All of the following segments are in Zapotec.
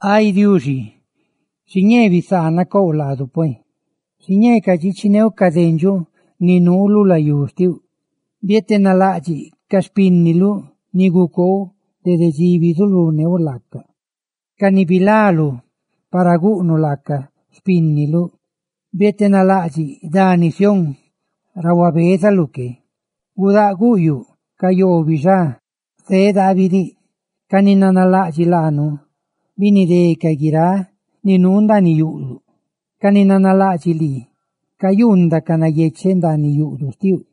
Ay Diuxi, xiñee bisaana couꞌ laadu pue. Xiñee cadxichineuꞌ ca dendxuꞌ ni nuu lu layú xtiuꞌ. Bietenalaꞌdxiꞌ ca xpínniluꞌ, ni gucoouꞌ dede dxi bizuluneuꞌ laacaꞌ, ca ni bilaluꞌ para guꞌnuꞌ laacaꞌ xpínniluꞌ; bietenalaꞌdxiꞌ dani Sión ra huabezaluꞌ que. Gudáꞌ guꞌyuꞌ ca yoo bixá zeꞌ daabi diꞌ; ¡ca ni nanalaꞌdxiꞌ laanu binidé guiráꞌ ni nuu ndaaniꞌ yuꞌduꞌ! Ca ni nanalaꞌdxiꞌ lii cayuundacaꞌ nayecheꞌ ndaaniꞌ yuꞌduꞌ xtiuꞌ;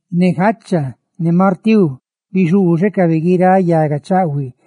ne jacha ne martíu bixuuxecabe guiráꞌ yaga ruzuchaahuine.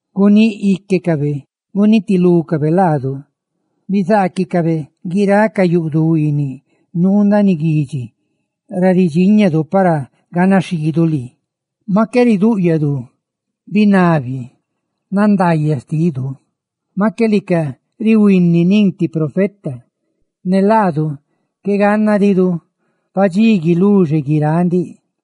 Guníꞌ íquecabe gunitilúcabe laadu; ¡bizaaquicabe guiráꞌ ca yuꞌduꞌ huiiniꞌ nuu ndaaniꞌ guidxi ra ridxíñadu para ganaxhiidu lii! Maꞌ qué ridúꞌyadu larindaayaꞌ xtidu; maꞌ qué lica rihuini nin ti profeta, ne laadu qué gannadidu padxí guiluxe guiráꞌ ndiꞌ.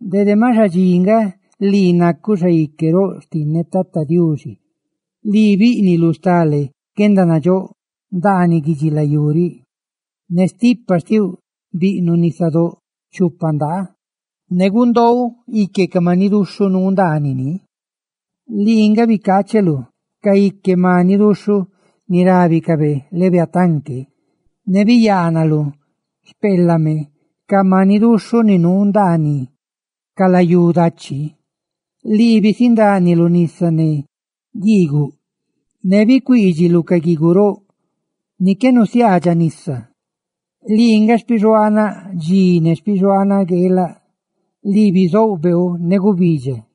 Dede maꞌ xadxi nga, lii nacuꞌ Xaique roꞌ xtinneꞌ. Ay Diuxi, lii bíꞌniluꞌ stale guendanandxóꞌ ndaaniꞌ guidxilayú riꞌ; ne stipa xtiuꞌ biꞌnuꞌ nisadóꞌ chupa ndaa, ne gundoouꞌ ique ca maniꞌ duxhuꞌ nuu ndaaniꞌ ni, lii nga bicaacheluꞌ ca ique maniꞌ duxhuꞌ ni rábicabe Leviatán que, ne biyaanaluꞌ xpeelame ca maniꞌ duxhuꞌ ni nuu ndaaniꞌ ca layú dachi. Lii bisindániluꞌ nisa ne guiiguꞌ, ne bicuuidxiluꞌ ca guiiguꞌ roꞌ ni qué nusiaadxaꞌ nisa. Lii nga xpixuaanaꞌ dxi ne xpixuaanaꞌ gueelaꞌ; lii bicoou beeu ne gubidxa;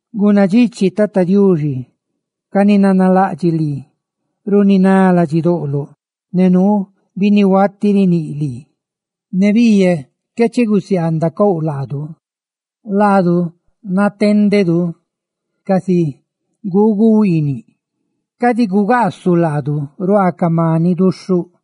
Gunnadxichi, Tata Diuxi, ca ni nanalaꞌdxiꞌ lii runiná ladxidoꞌloꞌ, ne nuu binnihuati riníꞌ lii. ¡Ne biiyaꞌ qué chigusiaanducouꞌ laadu! Laadu natendedu casi guugu huiiniꞌ; ¡cadi gugaasuꞌ laadu ruaa ca maniꞌ duxhuꞌ!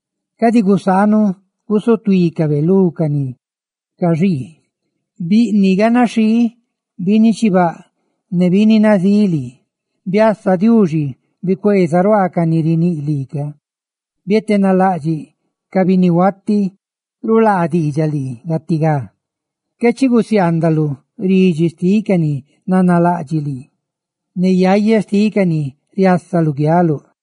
Cadi gusaanuꞌ gusutuícabe lú ca ni caxii; ¡biꞌniꞌ ganaxhii binni chibaꞌ ne binni nazíꞌ lii! ¡Ay Diuxi, biasa! ¡Bicueeza ruaa ca ni riníꞌ lii ca! ¡Bietenalaꞌdxiꞌ ca binnihuati rulaa diidxaꞌ lii gatigá! Qué chi gusiaandaluꞌ ridxi xtiꞌ ca ni nanalaꞌdxiꞌ lii, ne yaya xtiꞌ ca ni riasa luguialuꞌ.